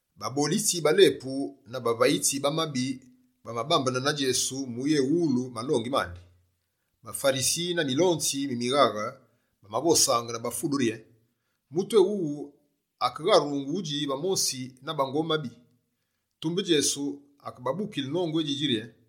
Babolitsi ba lepu na bavayitsi ba mabi bamabambene na Djesu mu uyéwulu malongi mandi. BaFarisi na Milonzi mi mighaghe bamavosaange ba fundu rye: «Mutu éwuwu akegharungu udji va mosi na bango mabi!» Tumbe, Djesu akebabukile nongu édjidji rye: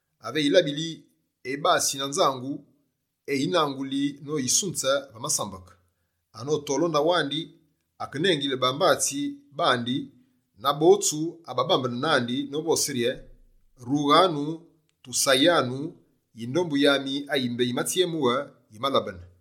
Ave eyilabili, ebasi na nzangu, eyinanguli no yisunze va masambeke. Anotole o ndaghu andi, akenengili bambatsi bandi na botsu ababambene nandi novose rye: “Rughanu, tusayanu: yindombu yami ayi mbé yimatsyemughe, yimalabene.”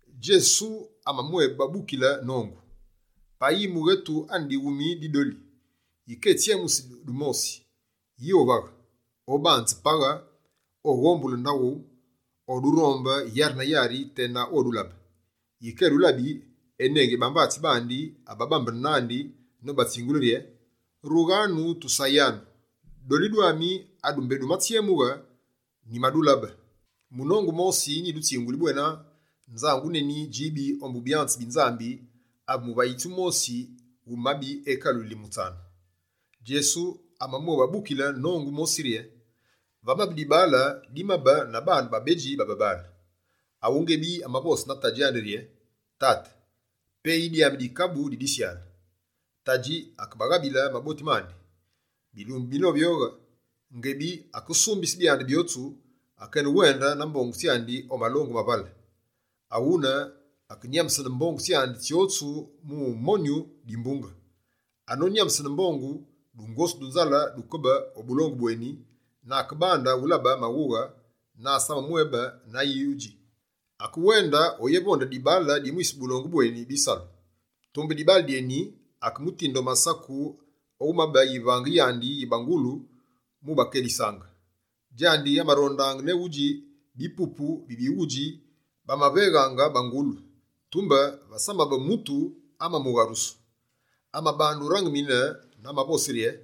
Djesu amamwébabukile nongu: «Payi mughetu ane dighumi di doli, yike etsyemusi dumosi, yi ovaghe? Obanze paghe, oghombule ndaghu, odurombe yari na yari tena odulabe. Yike edulabi, enengili bambatsi bandi ababambene nandi nobatsingule rye: “Rughanu, tusayanu, doli dwami adu mbé dumatsyemughe, nyimadulabe.” Munongu wumosi nyidutsinguli bwena: nzangu neni djibi ombu byanze bi Nzambi ave muvayitsi wumosi wu mabi ekaluyili mutsanu.» Djesu amamwébabukile nongu mosi rye: «Vamabe dibaale dimabe na baane babedji ba babaale, Awu ngebi amavose na tadji andi rye: “Tate, peyi dyami dikabu di disyale.” Tadji akebaghabile maboti mandi. Bilumbu binovyoghe, ngebi akesumbise byandi byotsu, akenewende na mbongu tsyandi o malongu ma vale. Aghune, akenyambesene mbongu tsyandi tsyotsu mu monyu dimbunge. Anonyambesene byotsu, dungosu du nzale dukabe o bulongu bweni na akebande ulabe maghughe na asamamwébe na ayi udji. Akewende oyevonde dibaale di mwise bulongu bweni bisalu. Tumbe dibaale dyeni, akemutinde o masaku o wumabe yivange yandi yi bangulu mu ubakelisaange. Djandi amarondaange ne udji bipupu bi bighudji bamaveghaange bangulu, tumbe vasamabe mutu amamugharusu. Amabande urangimine na amavose rye: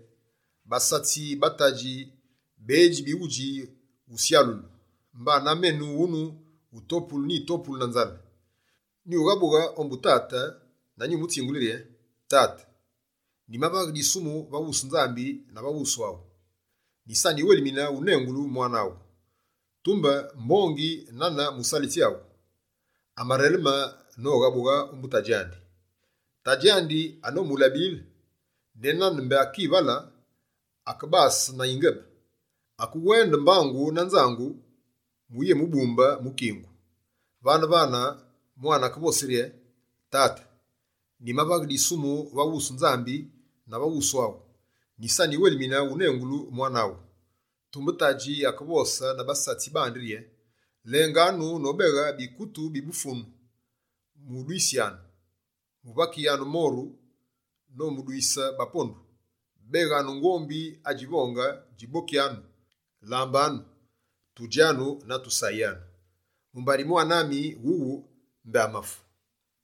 “Basatsi ba tate bedji bighudji usyalulu, mbana menu wunu utopulu nyi topulu na nzale. Nyughabughe ombu tate na nyumutsingule rye Tate, nyimavaghe disumu va wusu Nzambi na va wusu awu. Nyisa nyiwelimine wunengulu mwane aghu, tumbe mbongi na nane musalitsi aghu.” Amareleme noghabughe ombu tadji andi. Tadji andi anomulabile, ne nane mbé akivale, akebase na yingebe. Akewende mbangu na nzangu mu uyémubumbe mu kingu. Vane-vane, mwane akevose rye: “Tate, nyimavaghe disumu va wusu Nzambi na va wusu aghu. Nyisa nyiwelimine unengulu mwane aghu.” Tumbe tadji akevose na basatsi bandi rye: “Lenganu nobeghe bikutu bi dufunu, mudwisyanu, muvakighyanu moru nomudwise bapondu. Beghanu ngombi adjivonge, djibokyanu, lambanu, tudjanu na tusayanu, mumbari mwane ami wuwu mbé amafu,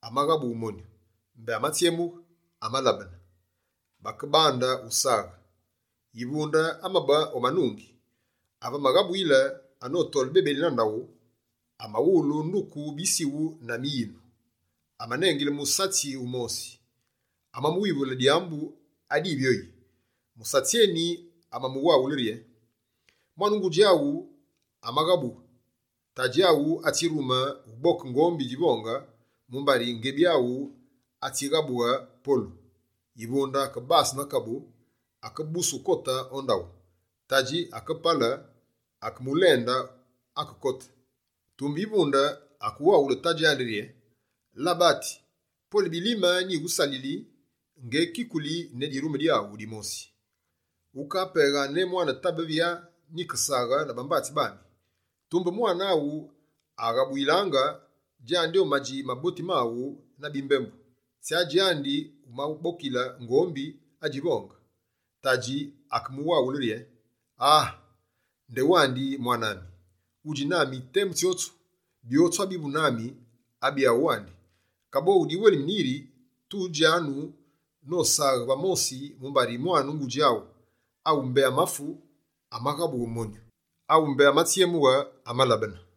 amaghabughe monyu; mbé amatsyemughe, amalabene.” Bakebande usaghe. Yivunde amabe o manungi. Ave amaghabuyile, anotole bebeli na ndaghu, amawulu nduku bisighu na miyinu. Amanengile musatsi wumosi, amamuwivule dyambu adivyoyi. Musatsi eni amamuwaghule rye: “Mwane ngudji aghu amaghabughe. Tadji aghu atsirume uboke ngombi djivonge, mumbari ngebi awu atsighabughe polu.” Yivunde akebase na kabu, akebuse ukote o ndaghu. Tadji akepale, akeyemulende akekote. Tumbe yivunde akewaghule tadji andi rye: “Labati, pwele bilime nyighusalili, ngekikuli ne dirume dyaghu dimosi. Ukapeghaange ne mwa tabe ‘vyaa’ nyikesaghe na bambatsi bami. Tumbe mwane awu aghabuyilaange, djandi omadji maboti maghu na bimbembu, tsya djandi wumabokile ngombi adjivonge!” Tadji akemuwaghule: “Aa! Ndewandi mwane ami, wudji nami temu djotsu, byotsu abivu nami, abyaghu wandi. Kaboghu diwelimine yiri tudjanu nosaghe va mosi, mumbari mwane ngudji aghu: Awu mbé amafu, amaghabughe monyu. Awu mbé amatsyemughe, amalabene.”»